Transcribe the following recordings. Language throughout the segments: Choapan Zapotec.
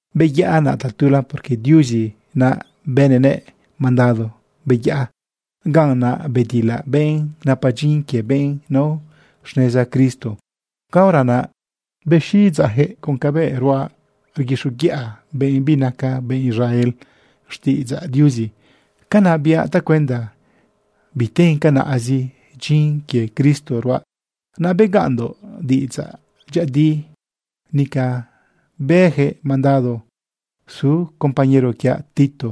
Beyaꞌa naꞌ tatula porque Diuzi naꞌ bënëꞌ mandado beyaꞌa. Ganꞌ naꞌ bedilaꞌ benꞌ napa dyin quie benꞌ nao xneza Cristo. Caora naꞌ bexiꞌidzeꞌyaquëꞌ con cabëꞌ ruaꞌ rguixoguiꞌa benꞌ binaca benꞌ Israel xtiꞌidzaꞌ Diuzi. Canaꞌ biaꞌ tacuenda biten canaꞌzi dyin quie Cristo ruaꞌ. Naꞌ begaꞌnndoꞌ diꞌidzaꞌ dyëꞌëdi. Nica bëjëꞌ mandado su compañero quiaꞌ Tito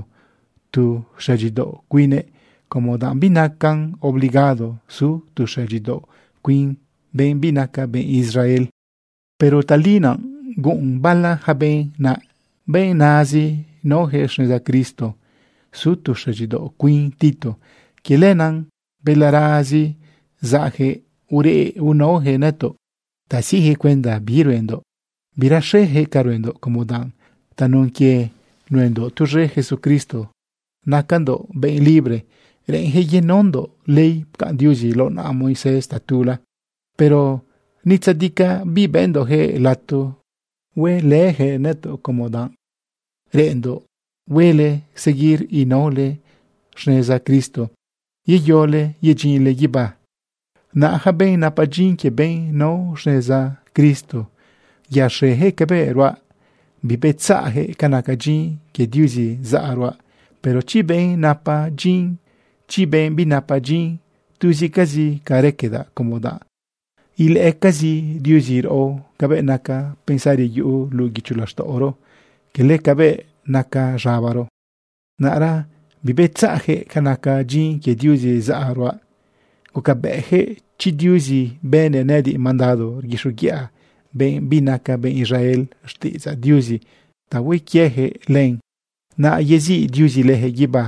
tu xëdyidaoꞌ cuine como danꞌ binacan obligado su tu xëdyidaoꞌ cuin benꞌ binaca benꞌ Israel. Pero tali naꞌ guꞌun bala yaca benꞌ naꞌ, benꞌ nazi naoyaquëꞌ xneza Cristo, su tu xëdyidaoꞌ cuin Tito. Quie lenaꞌ balarazi zaꞌyaquëꞌ urëꞌnaoyaquëꞌ nëtoꞌ ta siꞌjëꞌ cuenda bi ruendoꞌ. Biraxejëꞌ ca ruendoꞌ como danꞌ tanun quie nuendoꞌ tuz̃e Jesucristo nacandoꞌ benꞌ libre. Reꞌenyaquëꞌ yenaondoꞌ ley pcaꞌn Diuzi lao naꞌa Moisés tatula. Pero ni tzadicaꞌ bibëndoꞌyaquëꞌ lato huelëyaquëꞌ nëtoꞌ como danꞌ reꞌenndoꞌ huele seguir inaole xneza Cristo yeyole yedyinle guibá. Naꞌ yaca benꞌ napa dyin quie benꞌ nao xneza Cristo yaxejëꞌ cabëꞌ ruaꞌ bibetzaꞌyaquëꞌ ca naca dyin quie Diuzi zaꞌa ruaꞌ. Pero chi benꞌ napa dyin, chi benꞌ binapa dyin, tuzicazi ca raquedaꞌ como danꞌ ilëꞌëcazi Diuzi raꞌo cabëꞌ naca pensari yuꞌu luꞌu guicho laxtaꞌoro, cala cabëꞌ naca z̃abaro. Naꞌra bibetzaꞌyaquëꞌ ca naca dyin quie Diuzi zaꞌa ruaꞌ, gucabëꞌyaquëꞌ chi Diuzi bënëꞌ nëꞌëdiꞌ mandado rguixoguiꞌa benꞌ binaca benꞌ Israel xtiꞌidzaꞌ Diuzi ta hue quieyaquëꞌ len, naꞌ yeziꞌ Diuzi leyaquëꞌ guibá.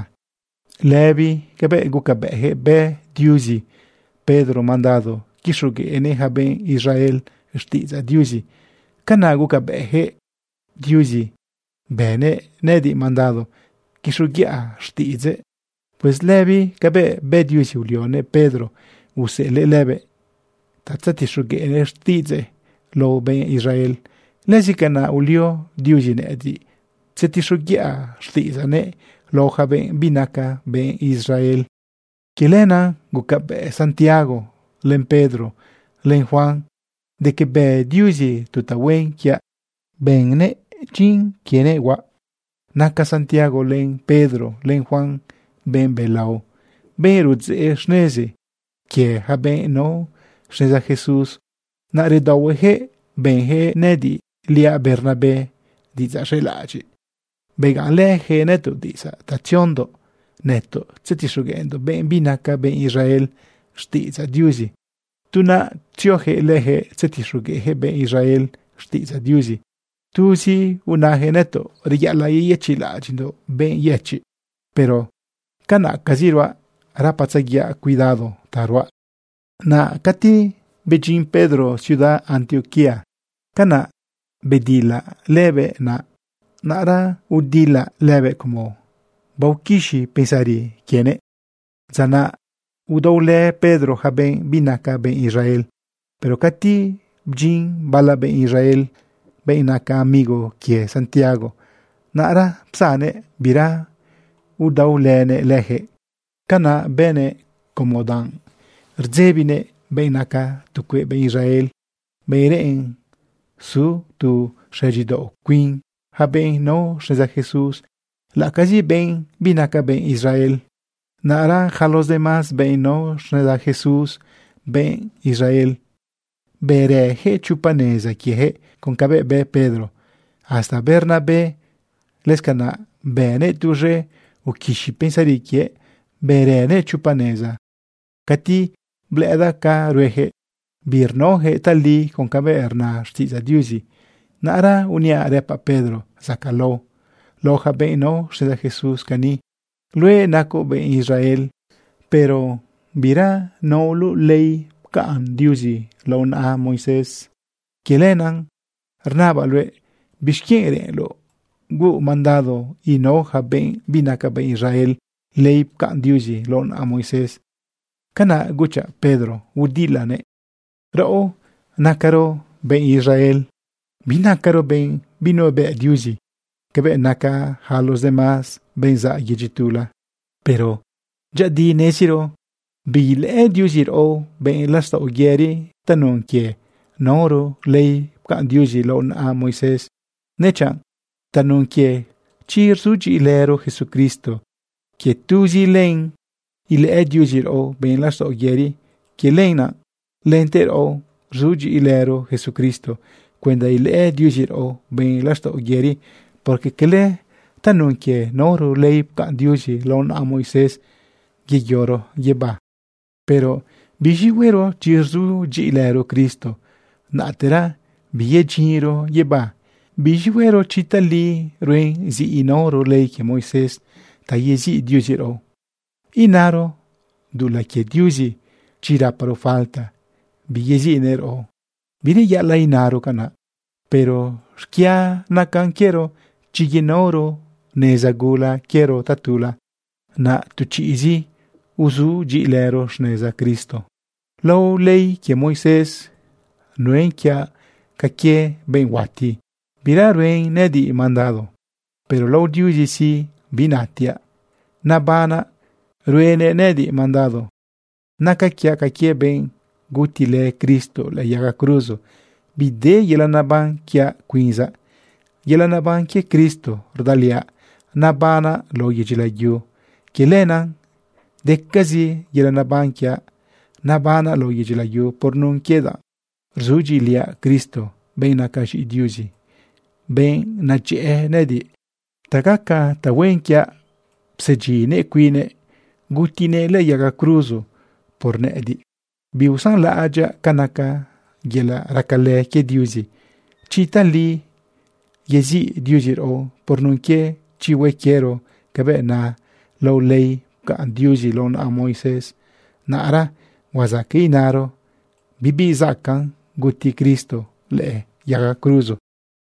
Lëbi cabëꞌ gucabëꞌyaquëꞌ bë Diuzi Pedro mandado quixogueꞌnëꞌ yaca benꞌ Israel xtiꞌidzaꞌ Diuzi, canaꞌ gucabëꞌyaquëꞌ Diuzi bënëꞌ nëꞌëdiꞌ mandado quixoguiꞌa xtiꞌidzëꞌ. Pues lëbi cabëꞌ bë Diuzi ulionëꞌ Pedro useꞌelëꞌ lëbëꞌ ta tzetixogueꞌnëꞌ xtiꞌidzëꞌ lao benꞌ Israel, lëzi canaꞌ ulio Diuzi nëꞌëdiꞌ tzetixoguiꞌa xtiꞌidzaꞌnëꞌ lao yaca benꞌ binaca benꞌ Israel. Quie lenaꞌ gucabëꞌ Santiago, len Pedro, len Juan de que bë Diuzi tu tahuen quiaꞌ, bënëꞌ dyin quienëꞌ huaꞌ. Naca Santiago, len Pedro, len Juan benꞌ belao, benꞌ rudzeꞌ xnezi quie yaca benꞌ nao xneza Jesús. Naꞌ redaohueyaquëꞌ bënyaquëꞌ nëꞌëdiꞌliaꞌ Bernabé diꞌidzaꞌ z̃elaꞌadyiꞌ. Begaꞌnlëyaquëꞌ nëtoꞌ diꞌidzaꞌ ta tziondoꞌ nëtoꞌ tzetixogueꞌndoꞌ benꞌ binaca benꞌ Israel xtiꞌidzaꞌ Diuzi, tu naꞌ tzioyaquëꞌ leyaquëꞌ tzetixogueꞌyaquëꞌ benꞌ Israel xtiꞌidzaꞌ Diuzi. Tuzi unayaquëꞌ nëtoꞌ reyaꞌalaꞌ yeyëchiꞌlaꞌadyiꞌndoꞌ benꞌ yëchiꞌ. Pero canaꞌcazi ruaꞌ rapatzaguiaꞌ cuidado ta ruaꞌ. Naꞌ cati bedyin Pedro ciudad Antioquía, canaꞌ bedilaꞌ lëbëꞌ naꞌ. Naꞌra udilaꞌ lëbëꞌ como baoquixi pensari quienëꞌ. Dza naꞌ udaolë Pedro yaca benꞌ binaca benꞌ Israel. Pero cati bdyin bala benꞌ Israel, benꞌ naca amigo quie Santiago, naꞌra psannëꞌ bira udaolënëꞌ leyaquëꞌ. Canaꞌ bënëꞌ como danꞌ rdzebinëꞌ benꞌ naca tu cueꞌ benꞌ Israel, benꞌ reꞌen su tu xëdyidaoꞌ cuin yaca benꞌ nao xneza Jesús, laꞌacazi benꞌ binaca benꞌ Israel. Naꞌra yaca los demás benꞌ nao xneza Jesús, benꞌ Israel, bërëyaquëꞌ chopa neza quieyaquëꞌ con cabëꞌ bë Pedro. Hasta Bernabé, lëscanaꞌ bënëꞌ tuz̃e uquixi pensari quiëꞌ, bërënëꞌ chopa neza. Cati blëꞌëdaꞌ ca ruejëꞌ, birnaojëꞌ tali con cabëꞌ rna xtiꞌidzaꞌ Diuzi, naꞌra uniaꞌ rëpaꞌ Pedro zacaꞌlao lao yaca benꞌ nao xneza Jesús cani: “Luëꞌ nacoꞌ benꞌ Israel, pero bira naoloꞌ ley pcaꞌn Diuzi lao naꞌa Moisés. Quie lenaꞌ rnabaꞌ luëꞌ, ¿bixquienꞌ reꞌenloꞌ huuꞌ mandado inao yaca benꞌ binaca benꞌ Israel ley pcaꞌn Diuzi lao naꞌa Moisés?” Canaꞌ guchaꞌ Pedro udilanëꞌ. Raꞌo nacaro benꞌ Israel. Binacaro benꞌ binuebëꞌ Diuzi cabëꞌ naca yaca los demás benꞌ zaꞌ yedyi tula. Pero dyëꞌëdi neziro biilëꞌë Diuzi raꞌo benꞌ laxtaꞌo yëri tanun quie naoro ley pcaꞌn Diuzi lao naꞌa Moisés, dechanꞌ tanun quie chi rzudyiꞌilëro Jesucristo. Quie tuzi len ilëꞌë Diuzi raꞌo benꞌ laxtaꞌo yëri. Quie lenaꞌ lente raꞌo, rzudyiꞌilëro Jesucristo cuenda ilëꞌë Diuzi raꞌo benꞌ laxtaꞌo yëri, porque cala tanun quie naoro ley pcaꞌn Diuzi lao naꞌa Moisés yeyoro guibá. Pero ¿biz̃i huero chi rzudyiꞌilëro Cristo, naꞌtera biyedyinro guibá? ¿Biz̃i huero chi tali ruen zi inaoro ley quie Moisés ta yeziꞌ Diuzi raꞌo? ¿Inaro dulaꞌ quie Diuzi chi raparo falta biyeziꞌnëꞌ raꞌo? ¡Bireyaꞌalaꞌ inaro canaꞌ! Pero xquia nacan quiero chi yenaoro neza gula quiero tatula, naꞌ tu chiꞌzi uzudyiꞌilëro xneza Cristo. Lao ley quie Moisés nuen quiaꞌ ca quie benꞌ huati, bira ruen nëꞌëdiꞌ mandado. Pero lao Diuzi sí, binatiaꞌ nabanaꞌ ruenëꞌ nëꞌëdiꞌ mandado. Naca quiaꞌ ca quie benꞌ gutilë Cristo lëꞌë yaga cruzo. Bide yelaꞌ neban quiaꞌ cuinzaꞌ, yelaꞌ neban quie Cristo rdaliaꞌ nabanaꞌ lao yedyi layu. Quie lenaꞌ decazi yelaꞌ neban quiaꞌ nabanaꞌ lao yedyi layu por nun quie danꞌ rzudyiꞌiliaꞌ Cristo, benꞌ naca z̃iꞌi Diuzi, benꞌ nadyëꞌë nëꞌëdiꞌ. Ta gaca tahuen quiaꞌ psedyinnëꞌ cuinnëꞌ gutinëꞌ lëꞌë yaga cruzo por nëꞌëdiꞌ. Biusanlaꞌadyaꞌ ca naca yelaꞌ racalë quie Diuzi. Chi tali yeziꞌ Diuzi raꞌo por nun quie chi hue quiero cabëꞌ na lao ley pcaꞌn Diuzi lao naꞌa Moisés, naꞌra huazaqueꞌ inaro bibi zacaꞌn guti Cristo lëꞌë yaga cruzo.